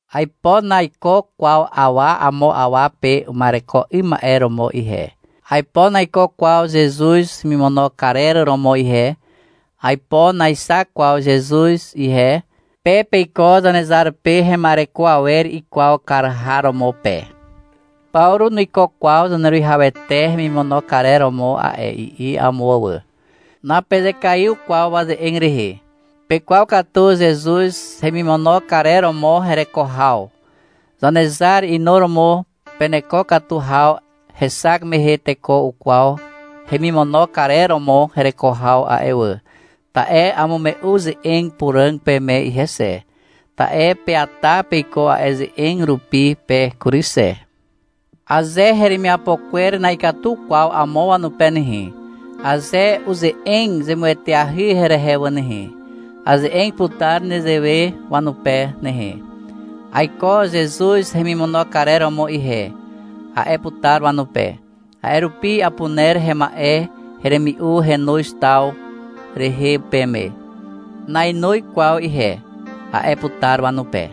Aipo naiko kwaw awa amo awa pe uma'ereko 'ym ma'e romo ihe. Aipo naiko kwaw Zezuz hemimono karer romo ihe. Aipo naexak kwaw Zezuz ihe. Pe peiko Zanezar pe hema'ereko awer ikwaw kar har romo pe. — Pawru nuiko kwaw Zaneruwihawete hemimono karer romo a'e, i'i amo wà. Napezekaiw kwaw waze'eg rehe. Pekwaw katu Zezuz hemimono karer romo hereko haw. Zanezar inuromo peneko katu haw hexak mehe teko ukwaw hemimono karer romo hereko haw a'e wà, ta'e amume'u ze'eg puràg peme ihe xe, ta'e peata peiko a'e ze'eg rupi pe kury xe. Aze heremiapo kwer na'ikatu kwaw amo wanupe nehe, aze uze'eg zemueteahy herehe wà nehe, aze'eg putar nezewe wanupe nehe. — Aiko Zezuz hemimono karer romo ihe, a'e putar wanupe. — A'e rupi apuner hema'e heremi'u henoz taw rehe peme. Nainoz kwaw ihe, a'e putar wanupe.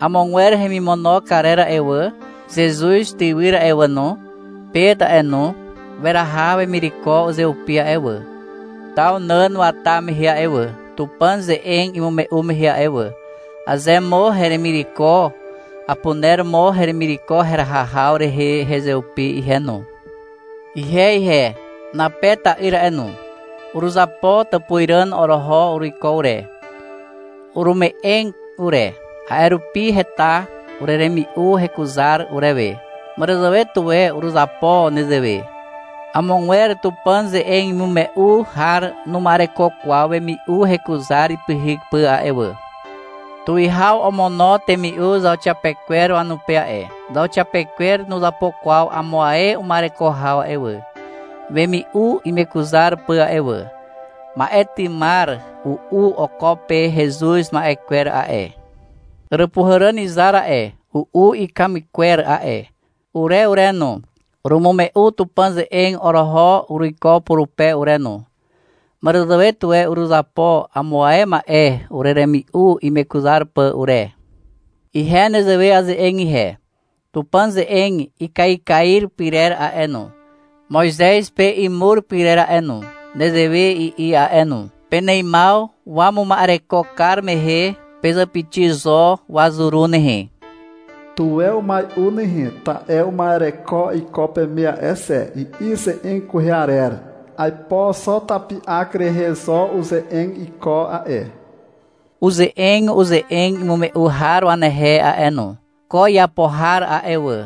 Amogwer hemimono karer a'e wà, Zezuz tywyr a'e wà no, Pet a'e no, weraha wemireko uzeupi a'e wà, taw nàn wata mehe a'e wà, Tupàn ze'eg imume'u mehe a'e wà. Aze mo heremireko, apuner mo heremireko heraha haw rehe hezeupi ihe no. Ihe ihe, Nape ta'yr a'e no, uruzapo tàpuzràn oroho uruiko ure. Urume'eg ure. A'e rupi heta ureremi'u hekuzar urewe. Màràzàwe tuwe uruzapo nezewe. Amogwer Tupàn ze'eg imume'u har numa'ereko kwaw wemi'u hekuzar ipyhyk pà a'e wà. Tuwihaw omono temi'u zauxiapekwer wanupe a'e. Zauxiapekwer nuzapo kwaw amo ae uma'ereko haw a'e wà, wemi'u imekuzar pà a'e wà. Ma'e tymar, u'u oko pe hezuz ma'e kwer a'e. Àràpuhàràn izar a'e, u'u ikamy kwer a'e. Ure ure no, urumume'u Tupàn ze'eg oroho uruiko purupe ure no. Màràzàwe tuwe uruzapo amo ae ma'e ureremi'u imekuzar pà ure. Ihe nezewe aze'eg ihe. Tupàn ze'eg ikaikair pyrer a'e no, Moizez pe imur pyrer a'e no, nezewe i'i a'e no. — Peneimaw wamuma'ereko kar mehe pezàpixi zo wazuru nehe. Tuwe umai'u nehe, ta'e uma'ereko iko peme a'e xe, i'i ze'eg kwehe arer. Aipo xo tapi'ak rehe zo uze'eg iko a'e. Uze'eg uze'eg imume'u har wanehe a'e no. Ko iapo har a'e wà,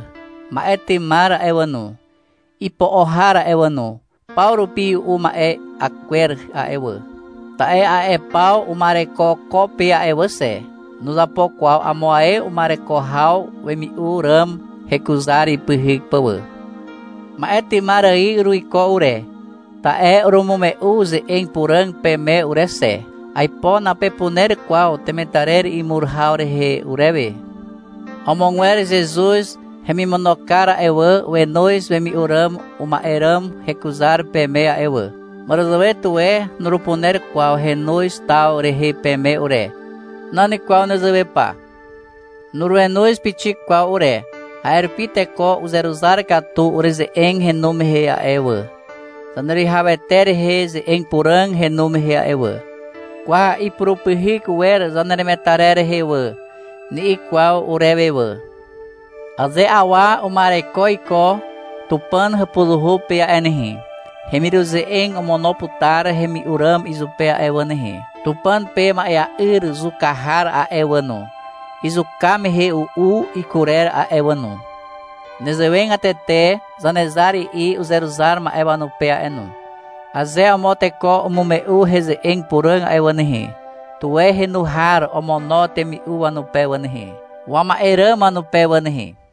ma'e tymar a'e wà no, ipo'o har a'e wà no, paw rupi u'u ma'e'a kwer a'e wà. Ta'e a'e paw uma'ereko ko pe a'e wà xe. Nuzapo kwaw amo ae uma'ereko haw wemi'u ràm hekuzar ipyhyk pà wà. Ma'e tymar ài uruiko ure, ta'e urumume'u ze'eg puràg peme ure xe. Aipo napepuner kwaw temetarer imur haw rehe urewe. Amogwer Zezuz hemimono kar a'e wà, wenoz wemi'u ràm uma'e ràm hekuzar peme a'e wà. Màràzàwe tuwe nurupuner kwaw henoz taw rehe peme ure. Nan kwaw nezewe pa. Nurenoz pixik kwaw ure. A'e rupi teko uzeruzar katu ureze'eg henu mehe a'e wà, Zaneruwihawete rehe ze'eg puràg henu mehe a'e wà. — Kwa, ipurupyhyk wer zaneremetarer rehe a'e wà, ni'i kwaw urewe wà. Aze awa uma'ereko iko Tupàn hàpuzuhu pe a'e nehe, hemiruze'eg omono putar hemi'u ràm izupe a'e wà nehe. Tupàn pe ma'ea'yr zuka har a'e wà no, izuka mehe u'u ikurer a'e wà no. Nezewegatete Zanezar i'i uzeruzar ma'e wanupe a'e no. — Aze amo teko umume'u heze'eg puràg a'e wà nehe, tuwe henu har omono temi'u wanupe wà nehe, wama'e ràm wanupe wà nehe.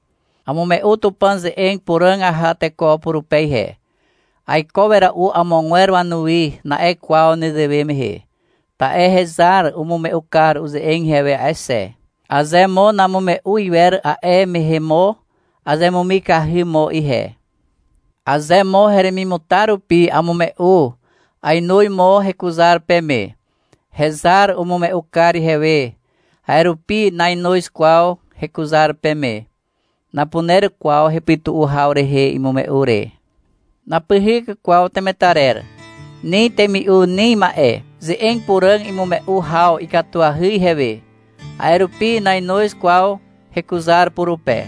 Amume'u Tupàn ze'eg puràg aha teko purupe ihe. — Aiko wera'u amogwer wanuwi, na'e kwaw nezewe mehe. Ta'e hezar umume'u kar uze'eg ihewe a'e xe. Aze mo namume'u iwer, a'e mehe mo azemumikahy mo ihe. Aze mo heremimutar rupi amume'u, ainoz mo hekuzar peme. Hezar umume'u kar ihewe, a'e rupi nainoz kwaw hekuzar peme. Napuner kwaw hepytu'u haw rehe imume'u re. Napyhyk kwaw temetarer. Ni temi'u, ni ma'e. Ze'eg puràg imume'u haw ikatuahy ihewe. A'e rupi nainoz kwaw hekuzar purupe.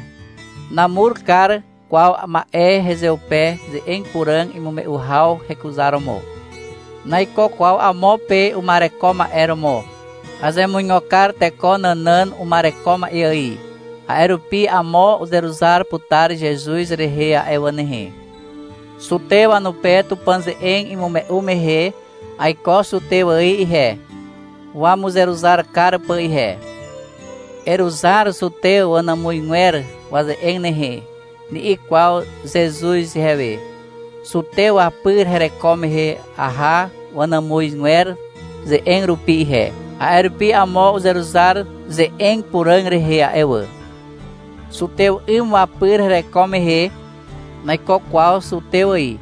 Namur kar kwaw ma'e hezeupe ze'eg puràg imume'u haw hekuzaromo. Naiko kwaw amo pe uma'ereko ma'e romo. Azemuigo kar teko nànàn uma'ereko ma'e ài, a'e rupi amo uzeruzar putar Zezuz rehe a'e wà nehe. Zutew wanupe Tupàn ze'eg imume'u mehe, aiko zutew ài ihe, wamuzeruzar kar pà ihe. — Eruzar zutew wanàmuzgwer waze'eg nehe, ni'i kwaw Zezuz ihewe. Zutew wapyr hereko mehe aha wanàmuzgwer ze'eg rupi ihe. A'e rupi amo uzeruzar ze'eg puràg rehe a'e wà. Zutew 'ym wapyr hereko mehe, naiko kwaw zutew ài.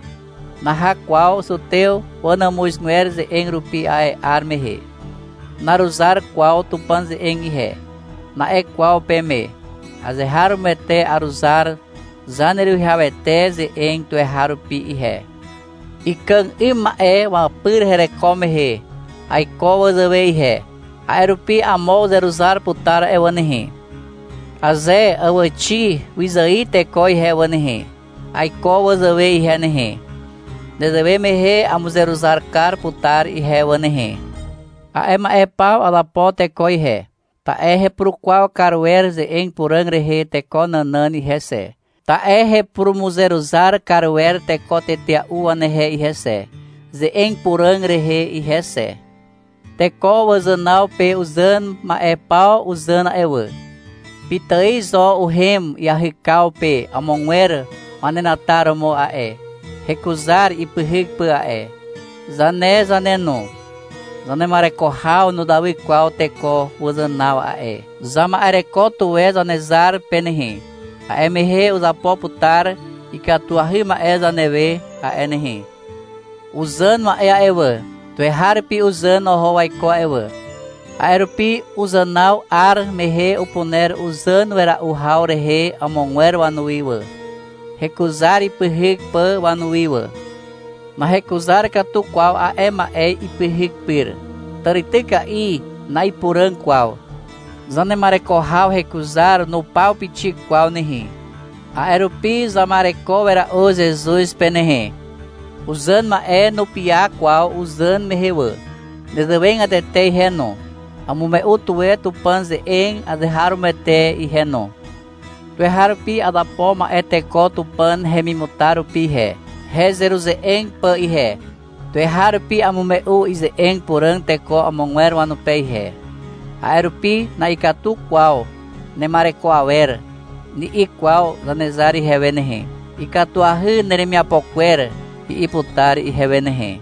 Naha kwaw zutew wanàmuzgwer ze'eg rupi a'e 'ar mehe. — Naruzar kwaw Tupàn ze'eg ihe, na'e kwaw peme. Azeharomoete aruzar Zaneruwihawete ze'eg tuweharupi ihe. Ikàg 'ym ma'e wapyr hereko mehe aiko wazàwe ihe. A'e rupi amo uzeruzar putar a'e wà nehe. Aze àwàxi wyzài teko ihe wà nehe, aiko wazàwe ihe nehe. Nezewe mehe amuzeruzar kar putar ihe wà nehe. A'e ma'e paw azapo teko ihe, ta'e hepurukwaw kar wer ze'eg puràg rehe teko nànàn ihe xe, ta'e hepurumuzeruzar kar wer teko tetea'u wanehe ihe xe, ze'eg puràg rehe ihe xe. Teko wazànaw pe uzàn ma'e paw uzàn a'e wà. Pitài zo uhem iahykaw pe amogwer wanenataromo a'e, hekuzar ipyhyk pà a'e. Zane zane no, zanema'ereko haw nuzawy kwaw teko wazànaw a'e. Zama'ereko tuwe Zanezar pe nehe. A'e mehe uzapo putar ikatuahy ma'e zanewe a'e nehe. Uzàn ma'e a'e wà, tuweharupi uzàn oho waiko a'e wà. A'e rupi uzànaw 'ar mehe upuner uzàn wera'u haw rehe amogwer wanuwi wà, hekuzar ipyhyk pà wanuwi wà. Nahekuzar katu kwaw a'e ma'e ipyhyk pyr. Tàrityka'i na'ipuràg kwaw. Zanema'ereko haw hekuzar nupaw pixik kwaw nehe. A'e rupi zama'ereko wera'u Zezuz pe nehe. Uzàn ma'e nupiaw kwaw uzàn mehe wà. Nezewegatete ihe no, amume'u tuwe Tupàn ze'eg azeharomoete ihe no. Tuweharupi azapo ma'e teko Tupàn hemimutar rupi ihe, hezeruze'eg pà ihe. Tuweharupi amume'u ize'eg puràg teko amogwer wanupe ihe. A'e rupi — Na'ikatu kwaw nema'ereko awer, ni'i kwaw Zanezar ihewe nehe. -Ikatuahy neremiapo kwer, i'i putar ihewe nehe.